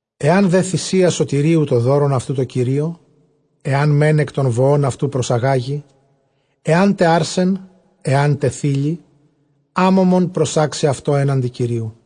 Ἐὰν δὲ θυσία σωτηρίου τὸ δῶρον αὐτοῦ τῷ Κυρίῳ, ἐὰν μὲν ἐκ τῶν βοῶν αὐτὸ προσαγάγῃ, ἐάν τω ἄρσεν, ἐάν τε θῆλυ, ἄμωμον προσάξει αὐτὸ ἔναντι Κυρίου.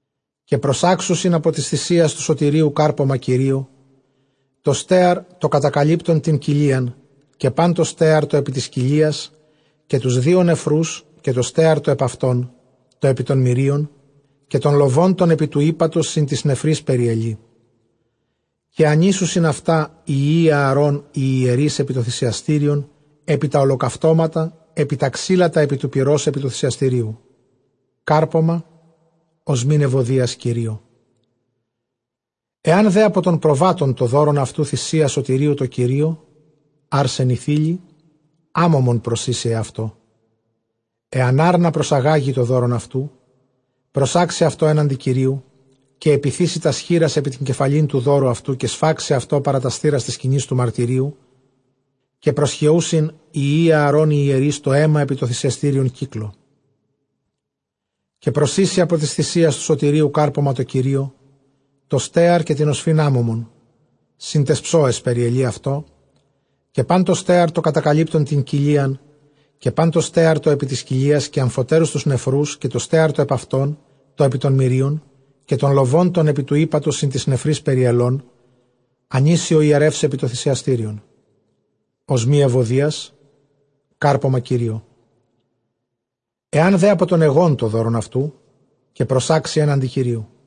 Καὶ προσάξουσιν ἀπὸ τῆς θυσίας τοῦ σωτηρίου κάρπωμα Κυρίῳ, τὸ στέαρ τὸ κατακαλύπτον τὴν κοιλίαν, καὶ πᾶν τὸ στέαρ τὸ ἐπὶ τῆς κοιλίας. Καὶ τοὺς δύο νεφροὺς, καὶ τὸ στέαρ τὸ ἐπʼ αὐτῶν, τὸ ἐπὶ τῶν μηρίων, καὶ τὸν λοβὸν τὸν ἐπὶ τοῦ ἥπατος σὺν τοῖς νεφροῖς περιελεῖ. Καὶ ἀνοίσουσιν αὐτὰ οἱ υἱοὶ Ἀαρὼν οἱ ἱερεῖς ἐπὶ τὸ θυσιαστήριον ἐπὶ τὰ ὁλοκαυτώματα ἐπὶ τὰ ξύλα, τὰ ἐπὶ τοῦ πυρὸς ἐπὶ τοῦ θυσιαστηρίου· κάρπωμα ὀσμὴ εὐωδίας Κυρίῳ. Ἐὰν δὲ ἀπὸ τῶν προβάτων τὸ δῶρον αὐτοῦ θυσία σωτηρίου τῷ Κυρίῳ, ἄρσεν ἢ θῆλυ, ἄμωμον προσοίσει αὐτό. Ἐὰν ἄρνα προσαγάγῃ τὸ δῶρον αὐτοῦ, προσάξει αὐτὸ ἔναντι Κυρίου. Καὶ ἐπιθήσει τὰς χεῖρας ἐπὶ τὴν κεφαλὴν τοῦ δώρου αὐτοῦ, καὶ σφάξει αὐτὸ παρὰ τὰς θύρας τῆς σκηνῆς τοῦ μαρτυρίου· καὶ προσχεοῦσιν οἱ υἱοὶ Ἀαρὼν οἱ ἱερεῖς τὸ αἷμα ἐπὶ τὸ θυσιαστήριον κύκλῳ. Καὶ προσοίσει ἀπὸ τῆς θυσίας τοῦ σωτηρίου κάρπωμα τῷ Κυρίῷ· τὸ στέαρ καὶ τὴν ὀσφὺν ἄμωμον σὺν ταῖς ψόαις περιελεῖ αὐτό· καὶ πᾶν τὸ στέαρ τὸ κατακαλύπτον τὴν κοιλίαν, καὶ πᾶν τὸ στέαρ τὸ ἐπὶ τῆς κοιλίας. Καὶ ἀμφοτέρους τοὺς νεφροὺς, καὶ τὸ στέαρ τὸ ἐπʼ αὐτῶν, τὸ ἐπὶ τῶν μηρίων, καὶ τὸν λοβὸν τὸν ἐπὶ τοῦ ἥπατος σὺν τοῖς νεφροῖς περιελὼν, ἀνοίσει ὁ ἱερεὺς ἐπὶ τὸ θυσιαστήριον· ὀσμὴ εὐωδίας κάρπωμα Κυρίῳ. Ἐὰν δὲ ἀπὸ τῶν αἰγῶν τὸ δῶρον αὐτοῦ, καὶ προσάξει ἔναντι Κυρίου.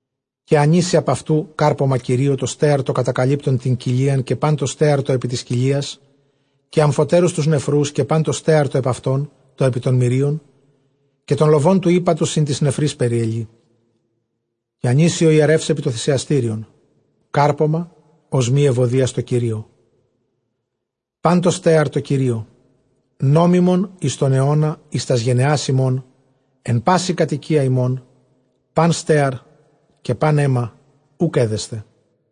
Καὶ ἀνοίσει ἀπʼ αὐτοῦ κάρπωμα Κυρίῳ τὸ στέαρ τὸ κατακαλύπτον τὴν κοιλίαν, καὶ πᾶν τὸ στέαρ τὸ ἐπὶ τῆς κοιλίας. Καὶ ἀμφοτέρους τοὺς νεφροὺς, καὶ πᾶν τὸ στέαρ τὸ ἐπʼ αὐτῶν, τὸ ἐπὶ τῶν μηρίων, καὶ τὸν λοβὸν τοῦ ἥπατος σὺν τοῖς νεφροῖς περιελεῖ, καὶ ἀνοίσει ὁ ἱερεὺς ἐπὶ τὸ θυσιαστήριον· κάρπωμα ὀσμὴ εὐωδίας τῷ Κυρίῳ· πᾶν τὸ στέαρ τῷ Κυρίῳ. Νόμιμον εἰς τὸν αἰῶνα εἰς τὰς γενεὰς ὑμῶν, ἐν πάσῃ κατοικίᾳ ὑμῶν· πᾶν στέαρ καὶ πᾶν αἷμα οὐκ ἔδεσθε.